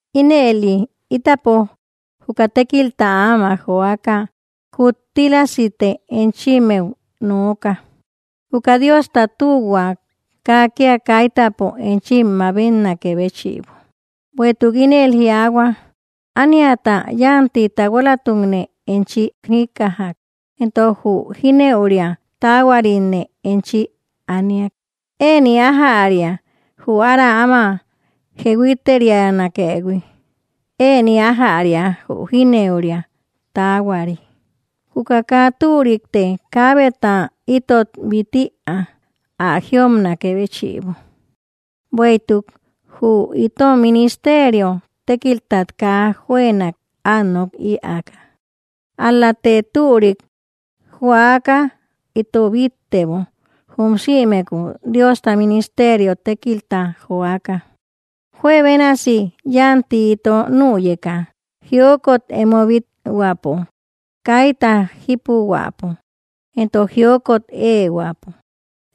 Ínëli itapo, juka tékilta ámak joaka, kuttílasite enchimmeu nooka juka Diosta tühua kaa kia kaitäpo enchim mabetnakë béchïbo. Bueïtuk ínel jiaahua: Aniata yanti tahualatukne enchi jikkajak; entok jü jinëuria taahuaritne enchi aniak. Ëni ajäria jü ára amä jehuiteterianakëhui; ëni ajäria jü jinëuria taahuari. Juka kaa türikte kaabeta itot bit ïa ä jïopnakë béchïbo, bueïtuk jü itom ministerio tekiltat kaa juënak at nok ïaka. Al‑late türik juaka ito bittebo jum sïmeku Diosta ministerio tékilta joaka, juebénasi yanti ito nüyeka, jiokot emo bit‑huäpo, kayta jipuhuäpo, entok jiokot eehuäpo.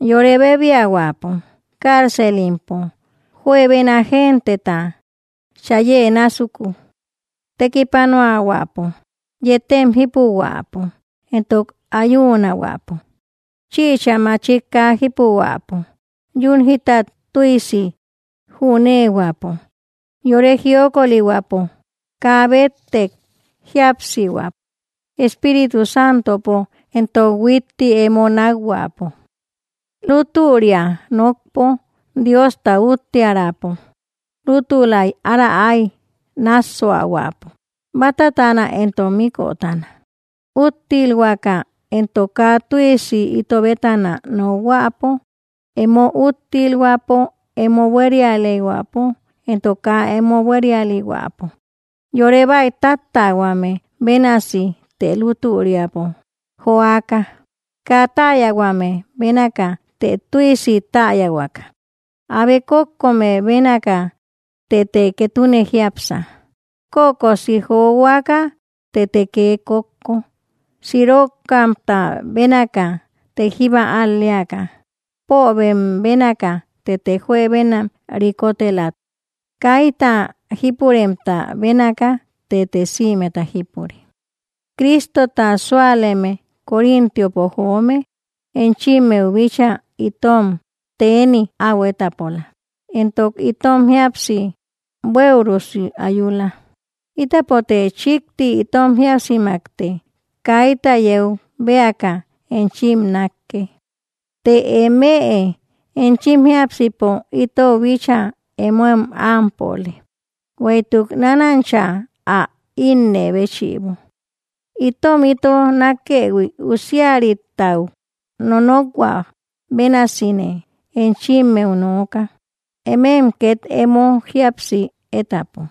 Yore bebiahuäpo, carcelimpo, juebena genteta chayë násuku, tekipanuahuäpo, yetem jípuhuäpo, entok ayunahuäpo. Chïcha machik kaa jipuhuäpo, yun jítat tüisi júnehuäpo, yore jiokolihuäpo, kaa bettek jíapsihuäpo, Espíritu Santopo, entok huitti emo nakhuäpo. Lútüria nokpo, Diosta úttiärapo, lutülay ára ái nassuahuäpo, batatana entok mikkotana. Úttilhuäka entok kaa tüisi ito bétana nokhuäpo emo úttilhuäpo, emo buérialihuäpo entok kaa emo buérialihuäpo; yore baïtattähuame bénasi të lutüriapo joaka. Kaa täyahuame bénaka, të tüisi täyahuaka; abe kókko me bénaka tëte ketune jiápsa, kökosi johuaka tëte kee kókko. Sirokamta bénaka, të jíba al‑leaka, pobem bénaka tëte juebenam rikotela, kayta jipuremta bénaka tëte sïmeta jípure. Cristota súaleme Corintiopo joome enchimmeu bíchaa itom teni au étapola; entok itom jíapsi bueürusi ayula. Itapote chikti itom jíapsimakte kayta yeu bëaka enchim nakkë, të emëe enchim jiápsipo itou bíchaa emoem ámpöle Bueïtuk nanancha ä innë béchïbo, itom ito nakëhui, usiaritau nonokhuä bénasine enchimmeu nooka, emem ket emo jíapsi étapo.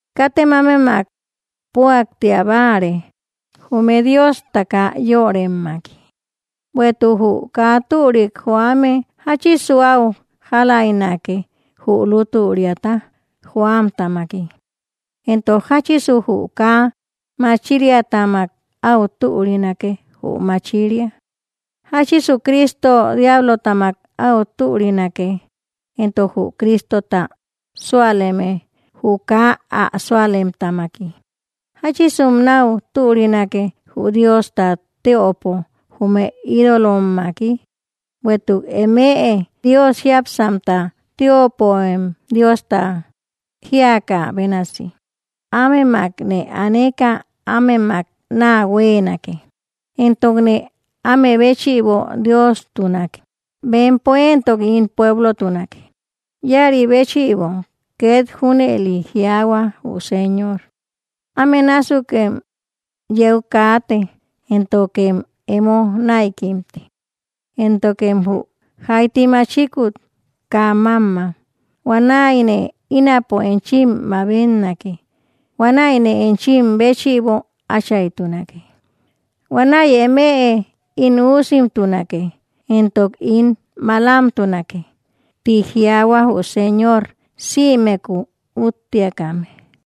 Katem ámemak puaktia báare jume Diosta kaa yöremmaki, ¿bueïtuk jü kaa türik joame jachisu au jaläinake jü lútüriata joamtamaki? ¿Entok jachisu jü kaa machiriatamak áu türinake jü machiria? ¿Jachisu, Cristo diablotamak au türinake? ¿Entok jü Cristota súaleme jü kaa ä sualemtamaki? ¿Jachisum nau türinake Jü Diosta teöpo, jume ídolommaki? Bueïtuk emëe Dios jiápsamta teöpöem, Diosta jiaka bénasi: Ámemakne aneka ámemak naa huenake, entokne amebéchïbo Diostunake, bempo entok ín pueblotunake. Ïaribéchïbo ket júneli jiaahua jü Señor: Ámenásukem yeu kaate, éntokem emo naïkimte; éntokem jü jaiti machikut kaa mamma. Huanaïne ínapo enchim mabetnake huanaïne enchim béchïbo achaytunake, huanaï emëe ín üusimtunake, entok ín malamtunake, tï jiaahua jü Señor sïmeku úttiakame.